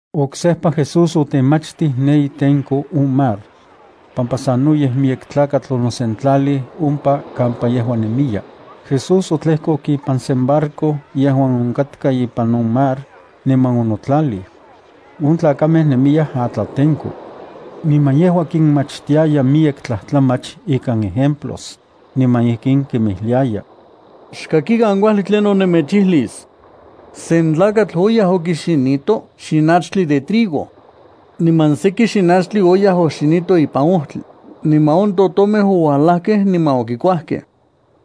Oksejpa Jesús otemachtij ne itenko on mar. Pampa sanoyej miyek tlakatl onosentlalij ompa kampa yejua nemiya, Jesús otlejkok ipan sen barco yejuan onkatka ipan on mar, niman onotlalij. On tlakamej nemiyaj atlatenko. Niman yejua kinmachtiaya miyek tlajtlamach ikan ejemplos, niman ijkin kinmijliaya: —Xkakikan kuajli tlinon nemechijlis. Sen tlakatl oyaj okixinito xinachtli de trigo. Niman seki xinachtli oxinito ipan ojtli, niman on totomej ouajlajkej niman okikuajkej.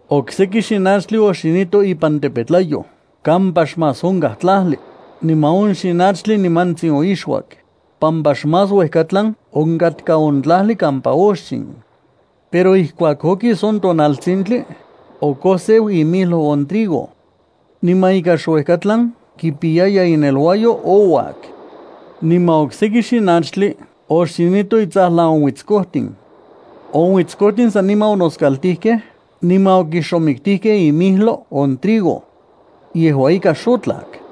Okseki xinachtli oxinito ipan tepetlayoj kampa xmás onkaj tlajli, niman on xinachtli nimantsin oixuak, pampa xmás uejkatlan onkatkaj on tlajli kampa oxin. Pero ijkuak okis on tonaltsintli, okoseu imijlo on trigo. Niman ika xuejkatlan kipiyaya ineluayo, ouajuak. Niman okseki xinachtli oxinito intsajlan uitskojtin. On uitskojtin saniman onoskaltijkej niman okixomiktijkej imijlo on trigo. Yejua ika xotlak.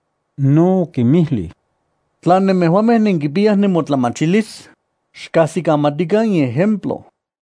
No okinmijlij: —Tla nemejuamej nenkipiyaj nemotlamachilis, xkajsikamatikan in ejemplo.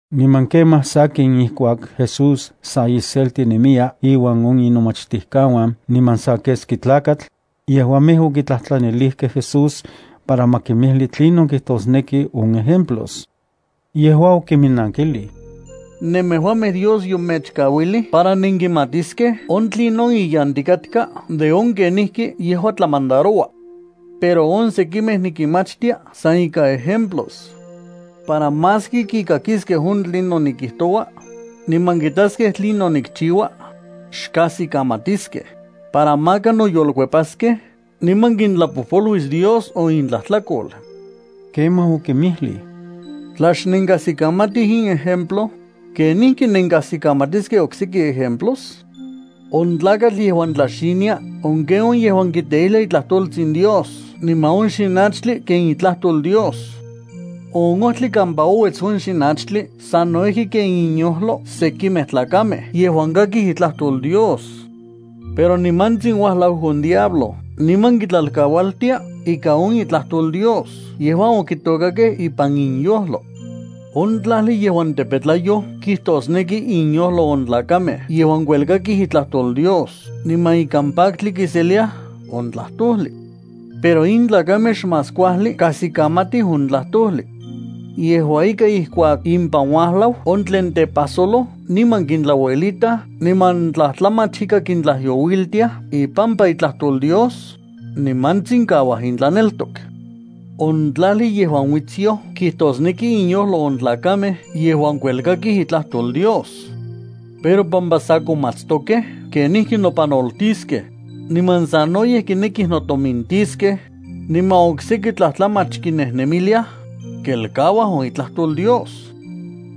Niman kemaj sakin ijkuak Jesús sa iselti nemiya inuan on inomachtijkauan niman sa keski tlakatl, yejuamej okitlajtlanilijkej Jesús para ma kimijli tlinon kijtosneki on ejemplos. Yejua okiminnankijlij: —Nemejuamej Dios yomechkauilij para nenkimatiskej on tlinon iyantikatka de on kenijki yejua tlamandaroua. Pero on oksekimej nikinmachtia san ikan ejemplos, para maski kikakiskej on tlinon nikijtoua, niman kitaskej tlinon nikchiua, xkajsikamatiskej, para maka noyolkuepaskej niman kintlapojpoluis Dios on intlajtlakol. Kemaj okinmijlij: —Tla xnenkajsikamatij in ejemplo, ¿kenijki nenkajsikamatiskej okseki ejemplos? On tlakatl yejuan tlaxinia, on ken on yejuan kiteijlia itlajtoltsin Dios niman on xinachtli ken itlajtol Dios. On ojtli kampa ouets on xinachtli sano ijki ken inyojlo sekimej tlakamej yejuan kakij itlajtol Dios. Pero nimantsin uajlau on diablo, niman kitlalkaualtia ika on itlajtol Dios yejuan okitokakej ipan inyojlo. On tlajli yejuan tepetlayoj kijtosneki inyojlo on tlakamej yejuan kuelkakij itlajtol Dios, niman ikan paktli kiseliaj on tlajtojli. Pero in tlakamej xmás kuajli kajsikamatij on tlajtojli. Yejua ika ijkuak impan uajlau on tlen tepajsoloj niman kintlauelitaj niman tlajtlamach ika kintlajyouiltiaj ipampa itlajtol Dios, nimantsin kauaj intlaneltok. On tlajli yejuan uitsyoj kijtosneki inyojlo on tlakamej yejuan kuelkakij itlajtol Dios. Pero pampa sa komatstokej kenijki nopanoltiskej, niman sanoyej kinekij notomintiskej, niman okseki tlajtlamach kinejnemiliaj, kelkauaj on itlajtol Dios.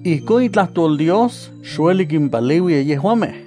Ijkon itlajtol Dios xueli kimpaleuiya yejuamej.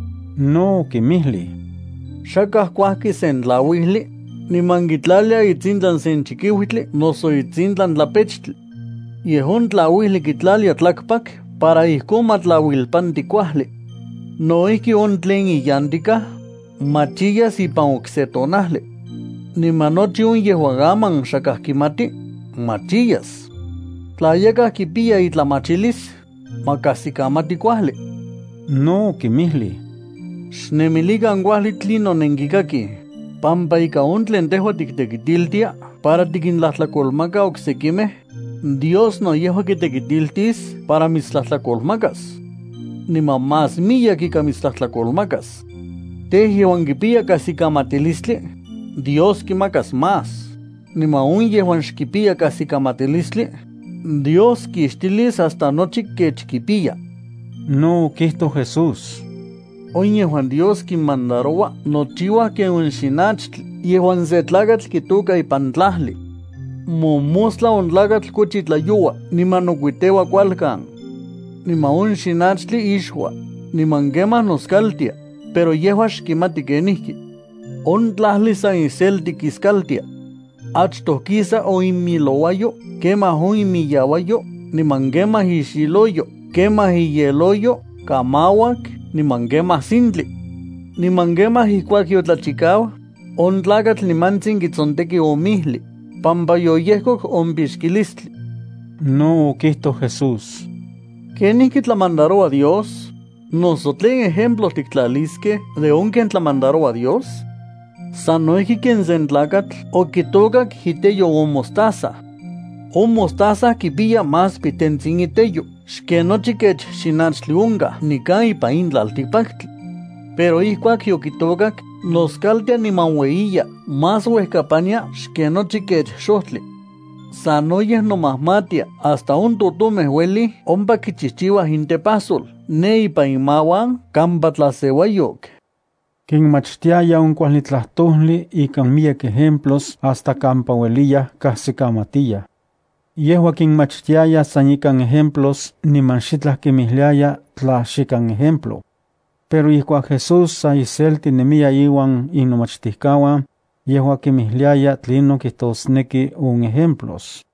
No okinmijlij: —Xakaj kuajki sen tlauijli, niman kitlalia itsintlan sen chikiutli noso itsintlan tlapechtli. Yej on tlauijli kitlalia tlakpak para ijkon ma tlauilpanti kuajli. No ijki, on tlen iyantikaj, machiyas ipan okse tonajli. Niman nochi on yejuan aman xakaj kimati, machiyas. Tla yakaj kipiya itlamachilis, ma kajsikamati kuajli. No okinmijlij: —Xnemilikan kuajli tlinon nenkikakij, pampa ika on tlen tejua tiktekitiltia para tikintlajtlakolmaka oksekimej, Dios no yejua kitekitiltis para mitstlajtlakolmakas. Niman más miyek ika mitstlajtlakolmakas. Tej, yejuan kipiya kajsikamatilistli, Dios kimakas más, niman on yejuan xkipiya kajsikamatilistli, Dios kixtilis hasta nochi kech kipiya. No okijtoj Jesús: —On yejuan Dios kinmandaroua nochiuaj ken on xinachtli yejuan sen tlakatl kitôka ipan tlajli. Mojmostla on tlakatl kochi tlayoua niman nokuiteua kualkan. Niman on xinachtli ixua, niman kemaj noskaltia, pero yejua xkimati kenijki. On tlajli san iselti kiskaltia. Achtoj kisa on imilouayo, kemaj on imiyauayo, niman kemaj ixiloyo, kemaj iyeloyo, kamauak, niman kemaj sintli. Niman kemaj ijkuak yotlachikau, on tlakatl nimantsin kitsonteki on mijli, pampa yoyejkok on pixkilistli. No okijtoj Jesús: —¿Kenijki tlamandaroua Dios? ¿Noso tlen ejemplo tiktlaliskej de on ken tlamandaroua Dios? Sano ijki ken sen tlakatl okitôkak iteyo on mostaza. On mostaza kipiya más pitentsin iteyo xken nochi kech xinachtli onkaj nikan ipan in tlaltikpaktli. Pero ijkuak yokitôkak, noskaltia niman ueyiya más uejkapania xken nochi kech xojtli. Sanoyej nomajmatia hasta on totomej uelij ompa kichijchiuaj intepajsol ne ipan imauan kampa tlaseuayok. Kinmachtiaya on kuajli tlajtojli ikan miyek ejemplos hasta kampa ueliyaj kajsikamatiyaj. Yejua kinmachtiaya san ikan ejemplos niman xitlaj kinmijliaya tla xikan ejemplo. Pero ijkuak Jesús sa iselti nemiya inuan inomachtijkauan, yejua kinmijliaya tlinon kijtosneki on ejemplos.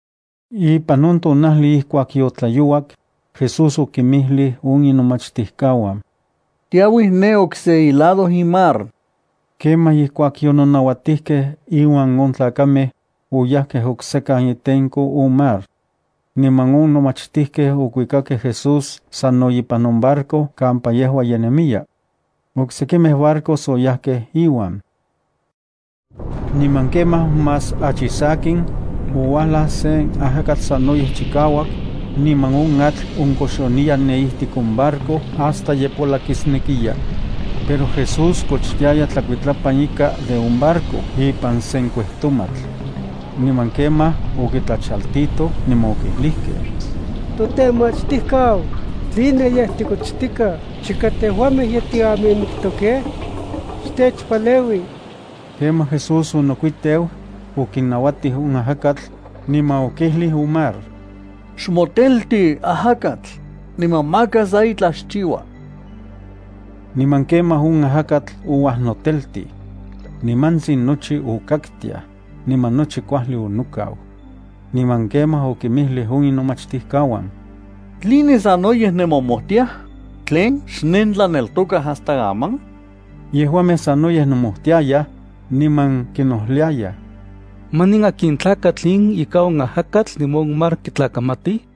Ipan on tonajli ijkuak yotlayouak, Jesús okinmijlij on inomachtijkauan: —Tiauij ne okse ilado in mar. Kemaj, ijkuak yononauatijkej inuan on tlakamej, oyajkej oksekan itenko on mar. Niman on nomachtijkej okuikakej Jesús sano ipan on barco kampa yejua ye nemiya. Oksekimej barcos oyajkej iuan. Niman kemaj más achi sakin, ouajlaj sen ajakatl sanoyej chikauak, niman on atl onkoxoniya ne ijtik on barco hasta ye polakisnekiya. Pero Jesús kochtiaya tlakuitlapan ika de on barco ipan sen kuejtomatl. Niman kemaj okitlachaltitoj, niman okijlijkej: —Totemachtijkau, ¿tline yej tikochtikaj chika tejuamej ye tiamimiktokej? ¡Xtechpaleui! Kemaj Jesús onotelkets, okinauatij on ajakatl, niman okijlij on mar: —Xmotelti ajakatl, niman maka sa itlaj xchiua. Niman kemaj on ajakatl ouajnoteltij. Nimantsin nochi okaktiaj, niman nochi kuajli onokau. Niman kemaj okinmijlij on inomachtijkauan: —¿Tline sanoyej nemomojtiaj? ¿Tlen, xnentlaneltokaj hasta aman? Yejuamej sanoyej nomojtiayaj, niman kinojliayaj: —¿Manin akin tlakatl in ika on ajakatl niman on mar kitlakamatij?